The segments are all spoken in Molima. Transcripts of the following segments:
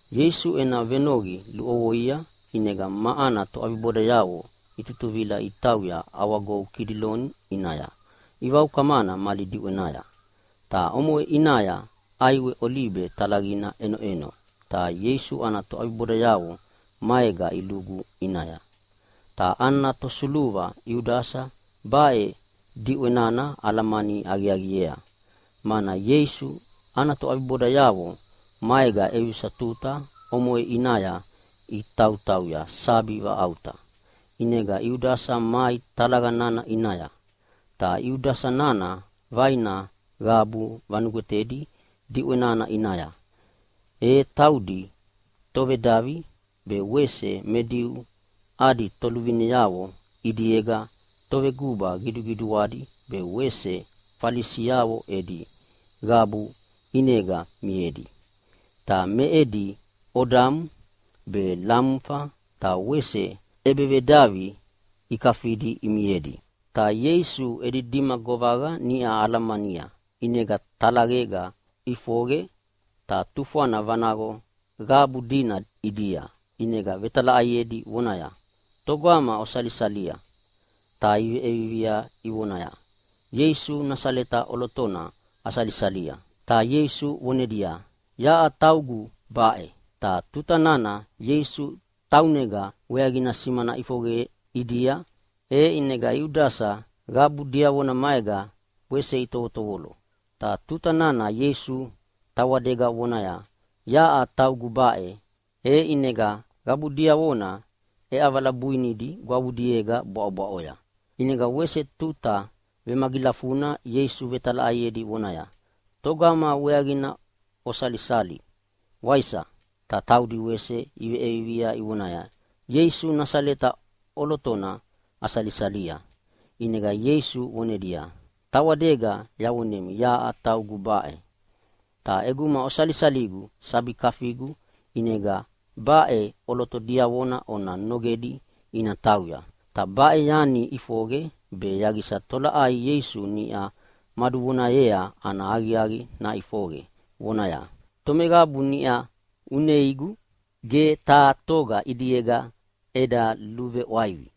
Ieisu ena venoqi luʼovoia, ʼinega ma ana toʼabibodayavo itutuvila itauya ʼAwagou Kidiloni ʼinaya ivaukamana mali diʼwenaya. Ta omoʼe ʼinaya ʼaiwe olibe talaqina ʼenoʼeno, ta Ieisu ana toʼabibodayavo maega ilugu ʼinaya. Ta ana tosuluva Iudasa baʼe diʼwe nana alamani aqiaqiea, mana Ieisu ana toʼabibodayavo maega ʼevisa tuta omoʼe ʼinaya itautauya sabi vaʼauta. ʼInega Iudasa mai talaqa nana ʼinaya. Ta Iudasa nana vaina qabu vanugwetedi diʼwe nana ʼinaya, e taudi tovedavi be wese me Diu adi toluvineavo ʼidiega toveguba qiduqiduadi be wese Falisiavo edi qabu ʼinega miedi. Ta me edi odamu be lamufa, ta wese ʼebevedavi ikafidi imiedi. Ta Ieisu edi dima govaqa niʼa alamania ʼinega talaqega ʼifoqe ta tufwana vanaqo qabu dina ʼidia, ʼinega vetalaʼaiedi vonaya, “Togama osalisalia?” Ta iveʼiea ivonaya, “Ieisu Nasaleta ʼolotona asalisalia!” Ta Ieisu vonedia, “Yaʼa taugu baʼe.” Ta tuta nana Ieisu taunega weaqina simana ʼifoqe ʼidia, e ʼinega Iudasa qabu diavona maega wese itovotovolo. Ta tuta nana Ieisu tawadega vonaya, “Yaʼa taugu baʼe.” E ʼinega qabu diavona ʼeʼavala buinidi gwavudiega bwaʼobwaʼoya! ʼInega wese tuta vemagilafuna Ieisu vetalaʼaiedi vonaya, “Togama weaqina osalisali, waisa?” Ta taudi wese iveʼiea ivonaya, “Ieisu Nasaleta ʼolotona asalisalia.” ʼInega Ieisu vonedia, “Tawadega yavonemi yaʼa taugu baʼe. Ta ʼeguma osalisaligu sabi kafigu, ʼinega baʼe ʼoloto diavona ona nogedi ina tauya.” Ta baʼe yanina ʼifoqe be yaqisa tolaʼai Ieisu niʼa maduvonayea ana aqiaqi naʼifoqe, vonaya, “Tomeqabu niʼa uneigu ge taha toga ʼidiega eda luveʼwaivi.”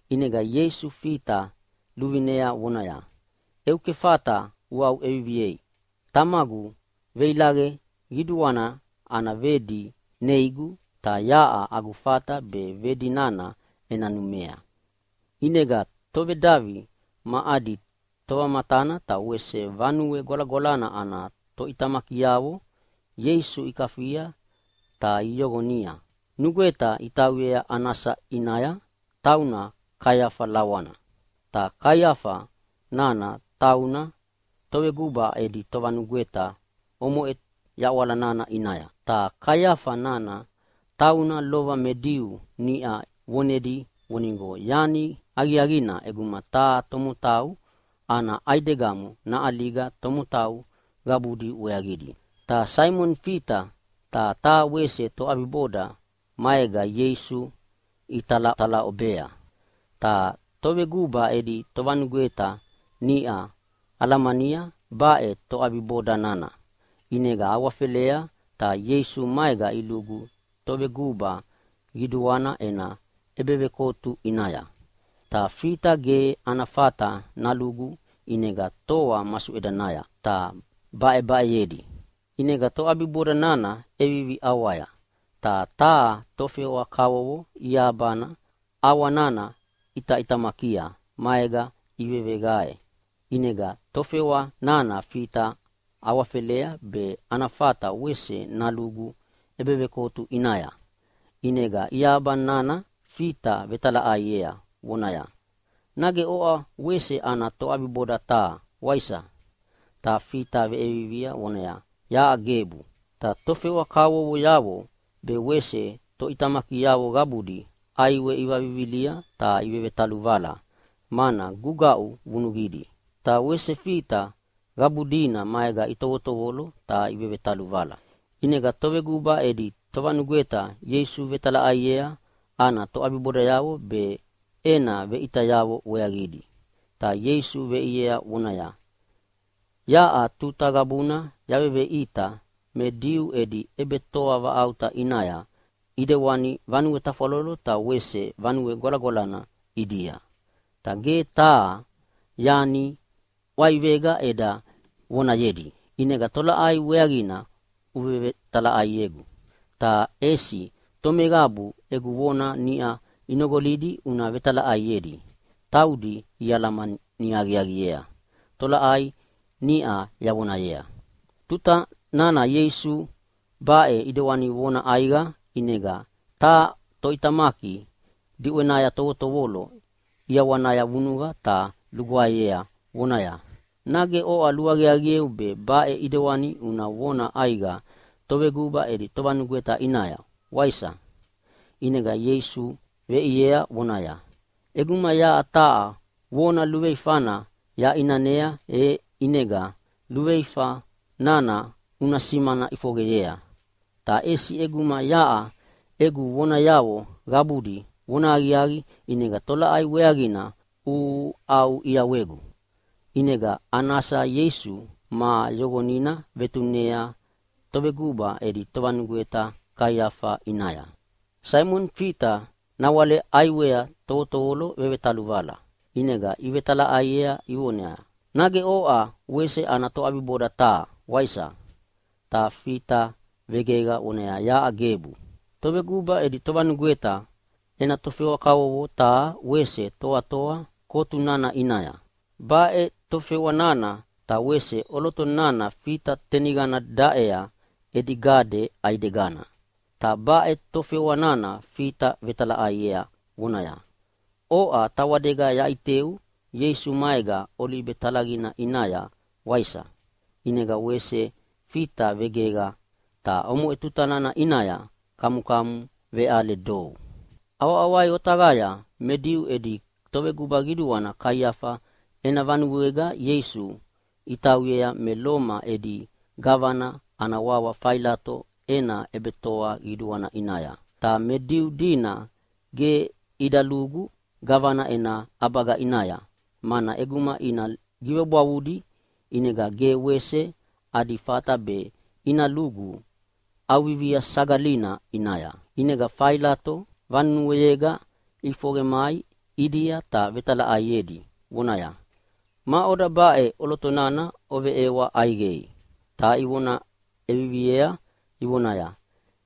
ʼInega Ieisu Fita luvinea vonaya, “Eu kefata uaʼuʼeviviei! Tamagu veilaqe qiduana ana vedi neigu, ta yaʼa agu fata be vedi nana ena numea.” ʼInega tovedavi ma adi tovamatana, ta wese Vanue Gwalagwalana ana toʼitamakiavo Ieisu ikafia ta iyoqonia. Nugweta itauyea Anasa ʼinaya, tauna Kaiafa lawana. Ta Kaiafa nana tauna toveguba edi tovanugweta omoʼe yaʼwala nana ʼinaya. Ta Kaiafa nana tauna lova me Diu niʼa vonedi vonigo yani aqiaqina ʼeguma taha tomotau ana ʼaidegamo naʼaliga tomotau qabudi weaqidi. Ta Saimoni Fita ta wese taha toʼabiboda maega Ieisu italatalaʼobea. Ta toveguba edi tovanugweta niʼa alamania baʼe toʼabiboda nana, ʼinega awafelea ta Ieisu maega ilugu toveguba qiduana ena ʼebevekotu ʼinaya. Ta Fita ge ana fata nalugu, ʼinega toa masuʼedanaya ta baʼebaʼeyedi. ʼInega toʼabiboda nana ʼevivi ʼawaya, ta taha tofewa kavovo iahabana ʼawa nana ʼitaʼitamakia maega iveveqae, ʼinega tofewa nana Fita awafelea be ana fata wese nalugu ʼebevekotu ʼinaya. ʼInega iahaba nana Fita vetalaʼaiea vonaya, “Nage oʼa wese ana toʼabiboda taha, waisa?” Ta Fita veʼiea vonaya, “Yaʼa gebu!” Ta tofewa kavovoyavo be wese toʼitamakiavo qabudi ʼaiwe ivavivilia ta ivevetaluvala, mana gugaʼu vunuqidi. Ta wese Fita qabu dina maega itovotovolo ta vevetaluvala. ʼInega toveguba edi tovanugweta Ieisu vetalaʼaiea ana toʼabibodayavo be ena veʼitayavo weaqidi. Ta Ieisu veʼiea vonaya, “Yaʼa tuta qabuna yaveveʼita me Diu edi ʼebetoa vaʼauta ʼinaya ʼidewani vanue tafwalolo ta wese Vanue Gwalagwalana ʼidia. Ta ge taha yani ʼwaivega eda vonayedi. ʼInega tolaʼai weaqina uvevetalaʼaiegu? Ta ʼesi tomeqabu egu vona niʼa inoqolia una vetalaʼaiedi. Taudi ialamani aqiaqiea tolaʼai niʼa yavonayea.” Ta tuta nana Ieisu baʼe ʼidewani vona ʼaiqa ʼinega taha toʼitamaki diʼwenaya tovotovolo ʼiawanaya vunuqa ta lugwaeyea vonaya, “Nage oʼa luaqiaqieu be baʼe ʼidewani una vona ʼaiqa toveguba edi tovanugweta ʼinaya, waisa?” ʼInega Ieisu veʼiea vonaya, “ʼEguma yaʼa taha vona luveifana yaʼinanea e ʼinega luveifa nana una simana ʼifoqeyea. Ta ʼesi ʼeguma yaʼa egu vonayavo qabudi vonahaqiaqi, ʼinega tolaʼai weaqina uʼauʼiawegu?” ʼInega Anasa Ieisu ma yoqonina vetunea toveguba edi tovanugweta Kaiafa ʼinaya. Saimoni Fita nawale ʼaiwea tovotovolo vevetaluvala, ʼinega ivetalaʼaiea ivonaya, “Nage oʼa wese ana toʼabiboda taha, waisa?” Ta Fita vegeqa vonaya, “Yaʼa gebu!” Toveguba edi tovanugweta ena tofewa kavovo taha wese toatoa kotu nana ʼinaya. Baʼe tofewa nana ta wese ʼoloto nana Fita teniqana niʼa daʼea edi gade ʼaidegana. Ta baʼe tofewa nana Fita vetalaʼaiea vonaya, “Oʼa tawadega yaʼiteu Ieisu maega olibe talaqina ʼinaya, waisa?” ʼInega wese Fita vegeqa, ta omoʼe tutana ʼinaya kamukamu veʼale dou. ʼAwaʼawai otaqaya me Diu edi toveguba qiduana Kaiafa ena vanuega Ieisu itauyea me Loma edi gavana ana wawa Failato ena ʼebetoa qiduana ʼinaya. Ta me Diu dina ge ida lugu gavana ena ʼabaga ʼinaya, mana ʼeguma ina givebwavudi ʼinega ge wese adi fata be ina lugu ʼAuvivia Sagalina ʼinaya. ʼInega Failato vanuega ʼifoqe mai ʼidia ta vetalaʼaiedi vonaya, “Maʼoda baʼe ʼoloto nana oveʼewa ʼaiqei?” Ta ivona ʼeviviea ivonaya,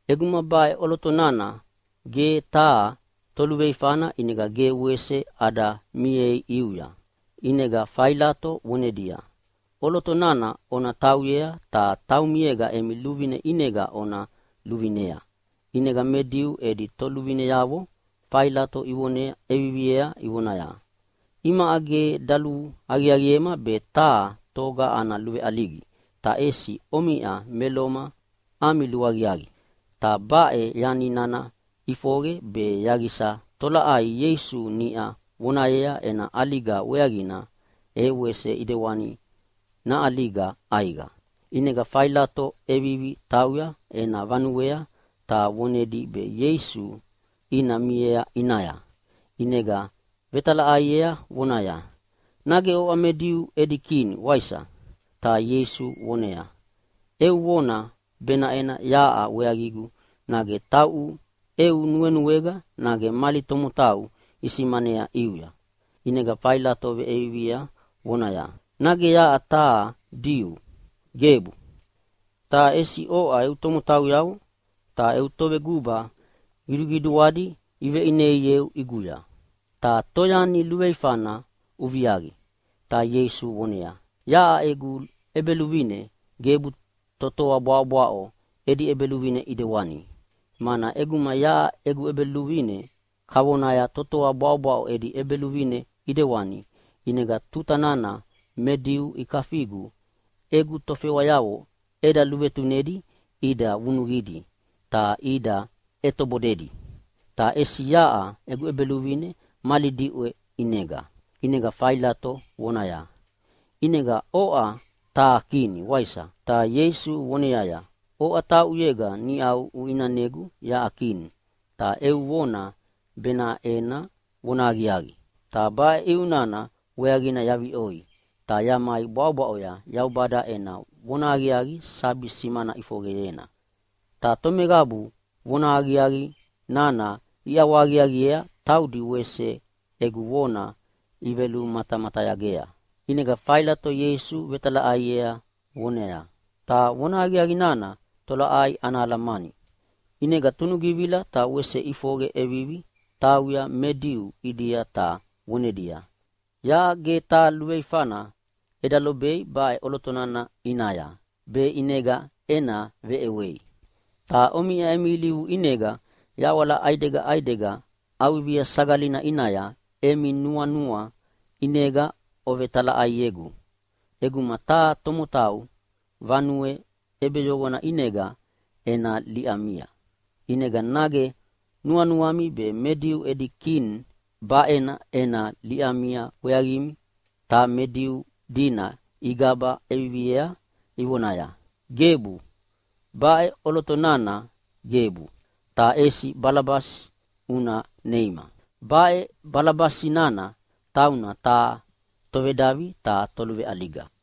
“ʼEguma baʼe ʼoloto nana ge taha toluveifana ʼinega ge wese ada miei ʼiuya.” ʼInega Failato vonedia, “ʼOloto nana ona tauyea ta taumiega emi luvine ʼinega ona luvinea!” ʼInega me Diu edi toluvineavo Failato ivona ʼeviviea ivonaya, “Imaʼa ge daluaqiaqiema be taha toga ana luveʼaligi, ta ʼesi omiʼa me Loma ami luaqiaqi.” Ta baʼe yani nana ʼifoqe be yaqisa tolaʼai Ieisu niʼa vonayea ena ʼaliga weaqina e wese ʼidewana naʼaliga ʼaiqa. ʼInega Failato ʼevivi tauya ena vanuea ta vonedi be Ieisu ina miea ʼinaya, ʼinega vetalaʼaiea vonaya, “Nage oʼa me Diu edi Kini, waisa?” Ta Ieisu voneaya, “Eu vona benaʼe yaʼa weaqigu nage tauʼu eu nuenuega nage mali tomotau isimanea ʼiuya?” ʼInega Failato veʼiea vonaya, “Nage yaʼa taha Diu? Gebu! Ta ʼesi oʼa eu tomotauyavo ta eu toveguba qiduqiduadi iveʼineieu ʼiguya. Ta toyani luveifana uviaqi?” Ta Ieisu voneaya, “Yaʼa egu ʼEbeluvine gebu totoa bwaʼobwaʼo edi ʼebeluvine ʼidewani. Mana ʼeguma yaʼa egu ʼEbeluvine kavona totoa bwaʼobwaʼo edi ʼebeluvine ʼidewani, ʼinega tuta nana me Diu ikafigu egu tofewayavo eda luvetunedi ida vunuqidi ta ida ʼetobodedi. Ta ʼesi yaʼa egu ʼEbeluvine mali diʼwe ʼinega.” ʼInega Failato vonaya, “ʼInega oʼa taha kini, waisa?” Ta Ieisu voneaya, “Oʼa tauʼuyega niʼa uʼinanegu yaʼa Kini, ta eu vona benaʼe vonahaqiaqi. Ta baʼe ʼiu nana weaqina yaviʼoi, ta yamai bwaʼobwaʼoya Yaubada ena vonahaqiaqi sabi simana ʼifoqena. Ta tomeqabu vonahaqiaqi nana iʼawahaqiaqiea taudi wese egu vona ivelumatamatayagea.” ʼInega Failato Ieisu vetalaʼaiea vonaya, “Ta vonahaqiaqi nana tolaʼai ana alamani?” ʼInega tunugivila ta wese ʼifoqe ʼevivi tauya Me Diu ʼidia ta vonedia, “Yaʼa ge taha luveifana eda lobei baʼe ʼoloto nana ʼinaya be ʼinega ena veʼewei. Ta omiʼa emi ilivu ʼinega yaʼwala ʼaidega ʼaidega ʼAuvivia Sagalina ʼinaya emi nuanua ʼinega ovevetalaʼaiegu ʼeguma taha tomotau vanue ʼebeyoqona ʼinega ena liʼamia. ʼInega nage nuanuami me Diu edi Kini baʼena ena liʼamia weaqimi?” Ta me Diu dina igaba ʼeviviea ivonaya, “Gebu, baʼe ʼoloto nana gebu, ta ʼesi Balabasi una neima!” Baʼe Balabasi nana tauna taha tovedavi ta toluveʼaliga.